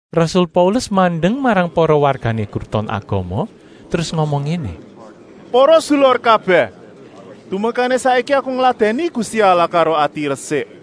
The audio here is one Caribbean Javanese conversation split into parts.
Rasul Paulus mandeng marang para wargané Kruton Agama, terus ngomong ngéné: “Para sedulur kabèh, tumekané saiki aku ngladèni Gusti Allah karo ati resik.”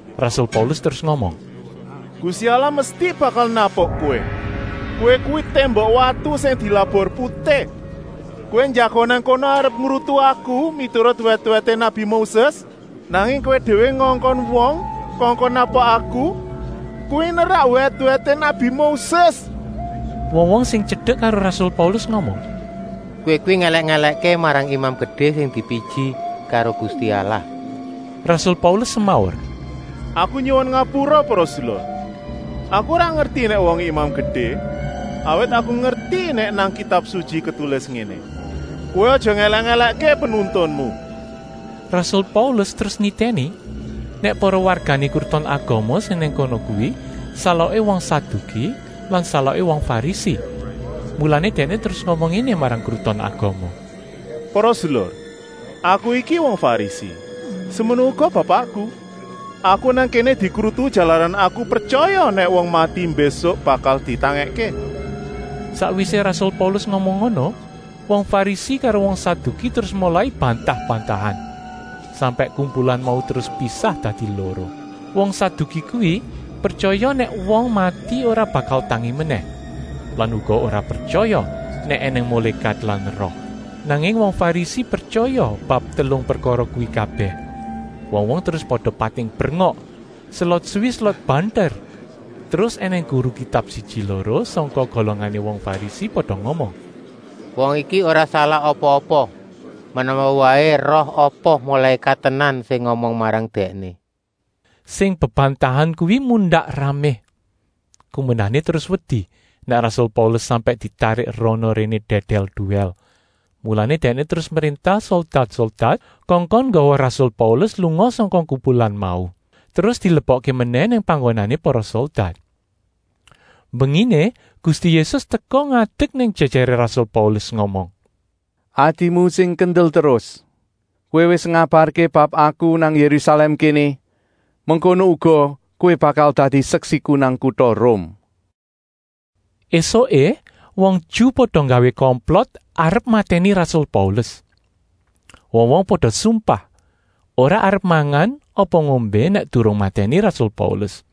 Rasul Paulus terus ngomong: “Gusti Allah mesti bakal napuk kowé. Kowé kuwi témbok watu sing dilabur putih. Kowé njagong nang kono arep ngrutu aku miturut wèt-wèté nabi Moses, nanging kowé déwé ngongkon wong kongkon napuk aku, kuwi nerak wèt-wèté nabi Moses.” Wong-wong sing tyedek karo rasul Paulus ngomong: “Kowé kuwi ngèlèk-èlèkké marang Imam Gedé sing dipiji karo Gusti Allah!” Rasul Paulus semaur: “Aku nyuwun ngapura para sedulur. Aku ora ngerti nèk wongé Imam Gedé, awit aku ngerti nèk nang Kitab Sutyi ketulis ngéné: ‘Kowé aja ngèlèk-èlèkké penuntunmu!’” Rasul Paulus terus nitèni, nèk para wargané Kruton Agama sing nang kono kuwi saloké wong Saduki lan saloké wong Farisi, mulané dèkné terus ngomong ngéné marang Kruton Agama: “Para sedulur, aku iki wong Farisi, semono uga bapakku. Aku nang kéné dikrutu jalaran aku pretyaya nèk wong mati mbésuk bakal ditangèkké.” Sakwisé rasul Paulus ngomong ngono, wong Farisi karo wong Saduki terus molai bantah-bantahan, sampèk kumpulan mau terus pisah dadi loro. Wong Saduki kuwi pretyaya nèk wong mati ora bakal tangi menèh lan uga ora pretyaya nèk ènèng mulékat lan roh, nanging wong Farisi pretyaya bab telung prekara kuwi kabèh. Wong-wong terus pada pating brengok, selot suwi selot banter. Terus ènèng guru Kitab siji-loro sangka golongané wong Farisi pada ngomong: “Wong iki ora salah apa-apa. Menawa waé roh apa mulékat tenan sing ngomong marang dèkné!” Sing bebantahan kuwi mundak ramé, kumendané terus wedi nèk rasul Paulus sampèk ditarik rana-réné dèdèl-duwèl. Mulané dèkné terus mréntah soldat-soldat kongkon nggawa rasul Paulus lunga sangka kumpulan mau, terus dilebokké menèh nang panggonané para soldat. Mbenginé Gusti Yésus teka ngadek nang jèjèré rasul Paulus ngomong: “Atimu sing kendel terus! Kowé wis ngabarké bab Aku nang Yérusalèm kéné, mengkono uga kowé bakal dadi seksiku nang kuta Rum.” Esuké wong Ju pada nggawé komplot arep matèni rasul Paulus. Wong-wong pada sumpah ora arep mangan apa ngombé nèk durung matèni rasul Paulus.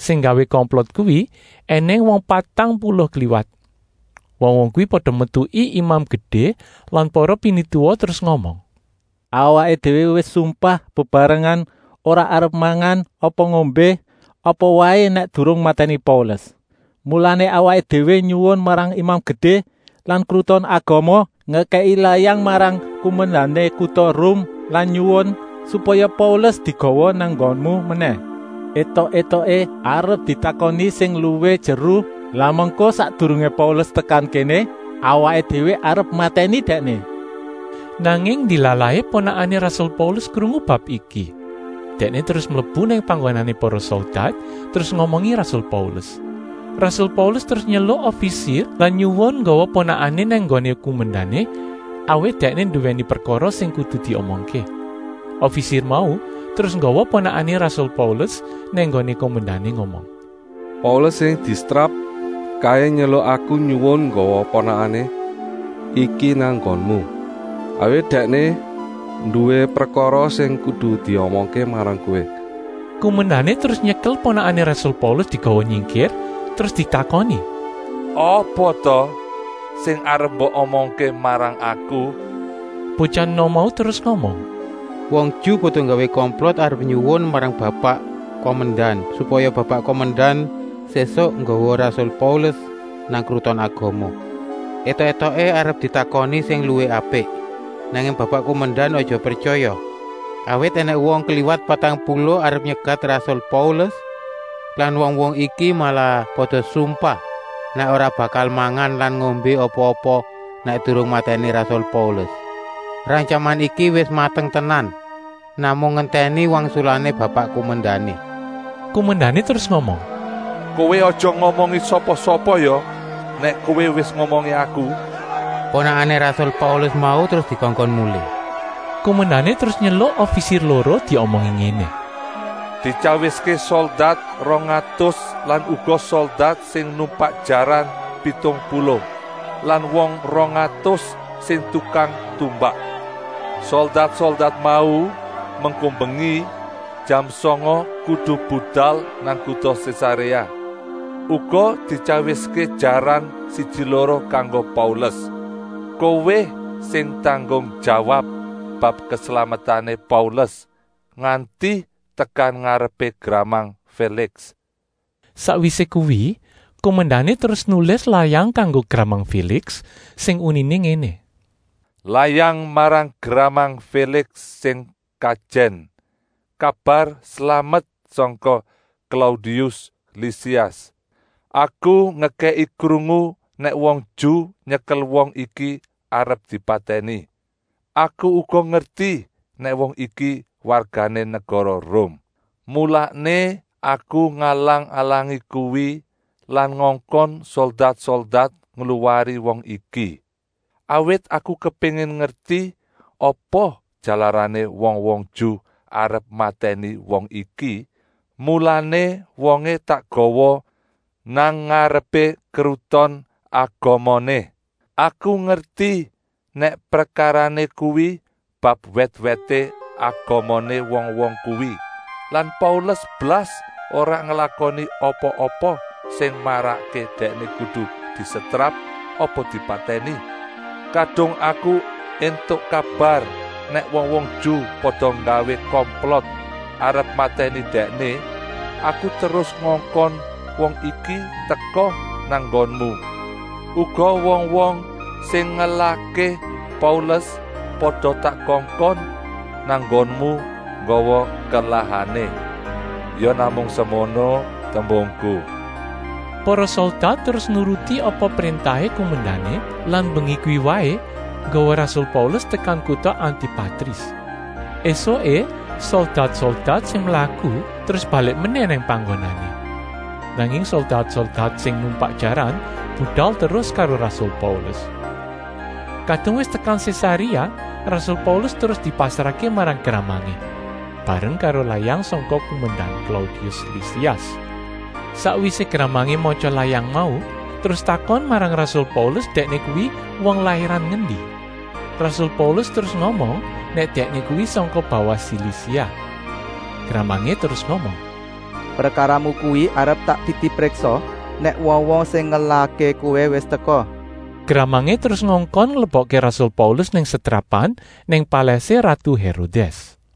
Sing nggawé komplot kuwi ènèng wong patang puluh kliwat. Wong-wong kuwi pada metuki Imam Gedé lan para pinituwa terus ngomong: “Awaké déwé wis sumpah bebarengan ora arep mangan apa ngombé apa waé nèk durung matèni Paulus. Mulané awaké déwé nyuwun marang Imam Gedé lan Kruton Agama ngekèki layang marang kumendané kuta Rum lan nyuwun, supaya Paulus digawa nang nggonmu menèh, étok-étoké arep ditakoni sing luwih jeru. Lah mengko sakdurungé Paulus tekan kéné awaké déwé arep matèni dèkné.” Nanging ndilalahé ponakané rasul Paulus krungu bab iki. Dèkné terus mlebu nang panggonané para soldat terus ngomongi rasul Paulus. Rasul Paulus terus nyeluk ofisir lan nyuwun nggawa ponakané nang nggoné kumendané, awit dèkné nduwèni prekara sing kudu diomongké! Ofisir mau terus nggawa ponakané rasul Paulus nang nggoné kumendané ngomong: “Paulus sing disetrap kaé nyeluk aku nyuwun nggawa ponakané iki nang nggonmu, awit dèkné nduwé prekara sing kudu diomongké marang kowé.” Kumendané terus nyekel ponakané rasul Paulus digawa nyingkir, terus ditakoni: “Apa ta sing arep mbok omongké marang aku?” Botyah enom mau terus ngomong: “Wong Ju pada nggawé komplot arep nyuwun marang Bapak kumendan, supaya Bapak kumendan sésuk nggawa rasul Paulus nang Kruton Agama, étok-étoké arep ditakoni sing luwih apik. Nanging Bapak kumendan aja pretyaya, awit ènèng wong kliwat patang puluh arep nyegat rasul Paulus lan wong-wong iki malah pada sumpah nèk ora bakal mangan lan ngombé apa-apa nèk durung matèni rasul Paulus. Rantyaman iki wis mateng tenan, namung ngentèni wangsulané Bapak kumendané.” Kumendané terus ngomong: “Kowé aja ngomongi sapa-sapa ya nèk kowé wis ngomongi aku!” Ponakané rasul Paulus mau terus dikongkon mulih. Kumendané terus nyeluk ofisir loro diomongi ngéné: “Dityawiské soldat rong atus lan uga soldat sing numpak jaran pitung puluh lan wong rong atus sing tukang tumbak. Soldat-soldat mau mengko mbengi jam sanga kudu budal nang kuta Sésaréa. Uga dityawiské jaran siji-loro kanggo Paulus. Kowé sing tanggung jawab bab keslametané Paulus nganti tekan ngarepé gramang Féliks.” Sakwisé kuwi kumendané terus nulis layang kanggo gramang Féliks sing uniné ngéné: Layang marang gramang Féliks sing kajèn, kabar slamet sangka Klaudius Lisias. Aku ngekèki krungu nèk wong Ju nyekel wong iki arep dipatèni. Aku uga ngerti nèk wong iki wargané negara Rum. Mulané aku ngalang-alangi kuwi lan ngongkon soldat-soldat ngluwari wong iki. Awit aku kepéngin ngerti apa jalarané wong-wong Ju arep matèni wong iki, mulané wongé tak gawa nang ngarepé Kruton Agamané. Aku ngerti nèk prekarané kuwi bab wèt-wèté agamané wong-wong kuwi lan Paulus blas ora nglakoni apa-apa sing marakké dèkné kudu disetrap apa dipatèni. Kadung aku éntuk kabar nèk wong-wong Ju pada nggawé komplot arep matèni dèkné, aku terus ngongkon wong iki teka nang nggonmu. Uga wong-wong sing ngelahké Paulus pada tak kongkon nang nggonmu nggawa kelahané. Ya namung semono tembungku. Para soldat terus nuruti apa préntahé kumendané lan mbengi kuwi waé nggawa rasul Paulus tekan kuta Antipatris. Esuké soldat-soldat sing mlaku terus balik menèh nang panggonané, nanging soldat-soldat sing numpak jaran budal terus karo rasul Paulus. Kadung wis tekan Sésaréa rasul Paulus terus dipasrahké marang gramangé, bareng karo layang sangka kumendan Klaudius Lisias. Sakwisé gramangé matya layang mau terus takon marang rasul Paulus dèkné kuwi wong lairan ngendi. Rasul Paulus terus ngomong nèk dèkné kuwi sangka bawah Silisia. Gramangé terus ngomong: “Prekaramu kuwi arep tak titipriksa nèk wong-wong sing ngelahké kowé wis teka.” Gramangé terus ngongkon nglebokké rasul Paulus nang setrapan nang palèsé ratu Hérodès.